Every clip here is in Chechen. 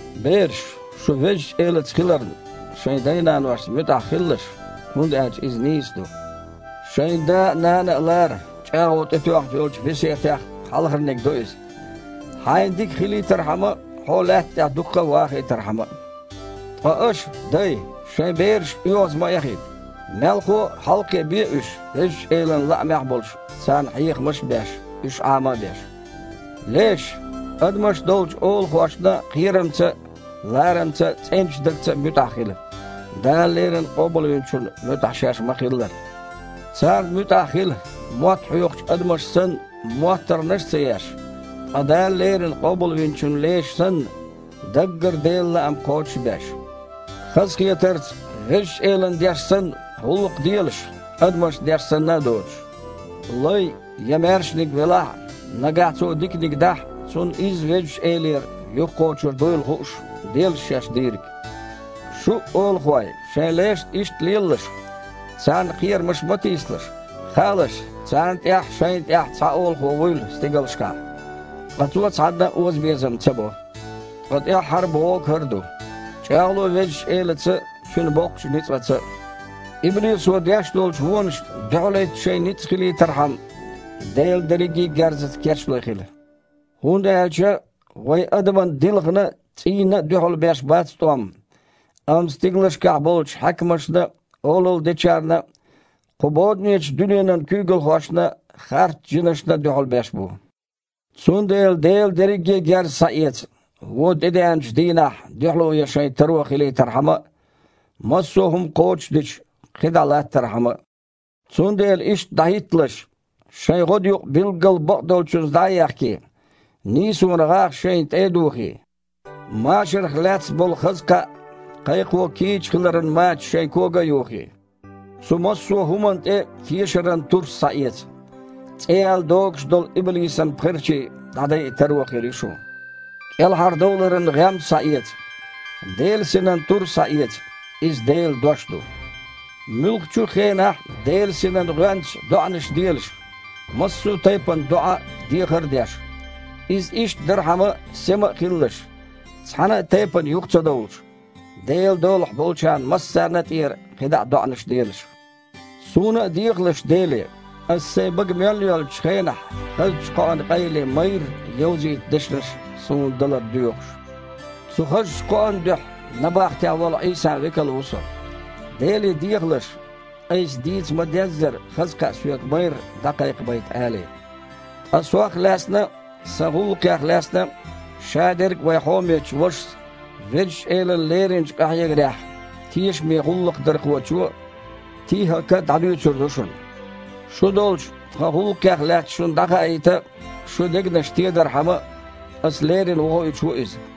Бераш, шу Везачу Элаца хиларна, шайн дай-наношна муьтІахь хилалаш, хІунда аьлча иза нийса ду. «Шайн да а, нана а лара» – чІагІо тІетоьхна йолчу весетех хьалхарниг ду иза: «хьайна дика дайтархьама а, хьо лаьтта тІехь дукха вахийтархьама а». Ткъа аша, дай, шайн бераш оьгІаз ма эхийта. Мелхо а, хьалакхиабе уьш, Везачу Элан лаамехь а болуш, царна хьехамаш а беш, уьш Іама а беш. Леш, адамаш долчу олахошна кхерамца а, ларамца а цІеначу дагца муьтІахь хила, Дала леррина Къобалвинчунна муьтІахь шаьш ма-хиллара. Царна муьтІахь хила, мотт хьоькхучу адамаша санна, моттаргІанаш а ца еш, ткъа Дала леррина Къобалвинчун леша санна, даггара Делан лаам кхочуш а беш. Хазахетарца, Везачу Элана деш санна, гІуллакх делаш, адамашна деш санна а доцуш. Лай я маьршаниг велахь а, нагахь цо диканиг дахь, цунна изза Везачу Элера юхакхочур дуйла хууш, делаш шаьш дийриг. Шу а, олахой, шайн лешца иштта лелалаш. Царна кхерамаш ма тийсалаш. Хаалаш, царна тІехь а, шайна тІехь а цхьа Олахо вуйла стигалшкахь, ткъа Цо цхьанна а озабезам ца бо. Ткъа тІаьххьара а бохург хІара ду: чІагІло Везачу Элаца а, Цуьнан боккхачу ницкъаца а. Иблисо деш долчу вонашна дуьхьалхІитта шайн ницкъ хилийтархьама, Делан дерриге а герзаца кечлой хила. ХІунда аьлча вай адаман дилхана а, цІийна а дуьхьал беш бац тІом, амма стигалшкахь болчу хьаькамашна а, олалла дечарна а, кху боданечу дуьненан куьйгалхошна а, харцжинашна а дуьхьал беш бу. Цундела Делан дерриге а герз схьаэца, вон тІедеанчу дийнахь дуьхьало ян шайн таро хилийтархьама а, массо а хІума кхочушдича, кхидІа а латтархьама а. Цундела иштта дІахІитталаш: шайн гІодаюкъ билггал бакъдолчуьнца дІа а ехкий, нийсонан гІагІ шайна тІе а духий, машарах лаьцна болу хаза кхаъ кхайкхо кийча хиларан мачаш шайн кога а юхий. Цу массо а хІуманна тІе тешаран турс схьаэца – цІе яьлла догуш долу иблисан пхерчий дІадайа таро хир ю шун. КІелхьардовларан гІем а схьаэца. Делан Синан тур а схьаэца – иза Делан дош ду. Муьлххачу а хенахь Делан Синан гІоьнца доІанаш делаш, массо а тайпана доІа а, дехар а деш. Иза иштта дархьама, сема а хилалаш, цхьана а тайпана юха ца довлуш, Делан долахь болчарна массарна а тІера кхидІа доІанаш а делаш. Суна а дехалаш Деле, аса сайн бага мел йоьллучу хенахь хазачу кхоан къайле майрра йовзийта дешнаш суна далар доьхуш. Цу хазачу кхоан дуьхьа набахтехь волу Іийсан векал ву со. Деле дехалаш, айса дийца ма-деззара, хаза кхаъ соьга майрра дІакхайкхабайта алий. Ткъа сох лаьцна а, сан гІуллакхех лаьцна а – шадерг а вайн хьомечу вашас, Везачу Элана леринчу къахьегарехь тешамечу гІуллакхдархочо ТихІака дІадуьйцур ду шуна. Шу долчу, тхан гІуллакхех лаьцна шуна дІахаийта а, шун дегнаш тедархьама а, аса леррина вохуьйтуш ву иза.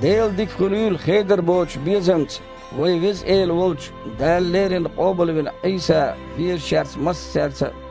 Делан дика хуьлийла хедар боцучу безамца вайн Веза Эла волчу, Дала леррина къобалвина Іийса везачаьрца массаьрца а.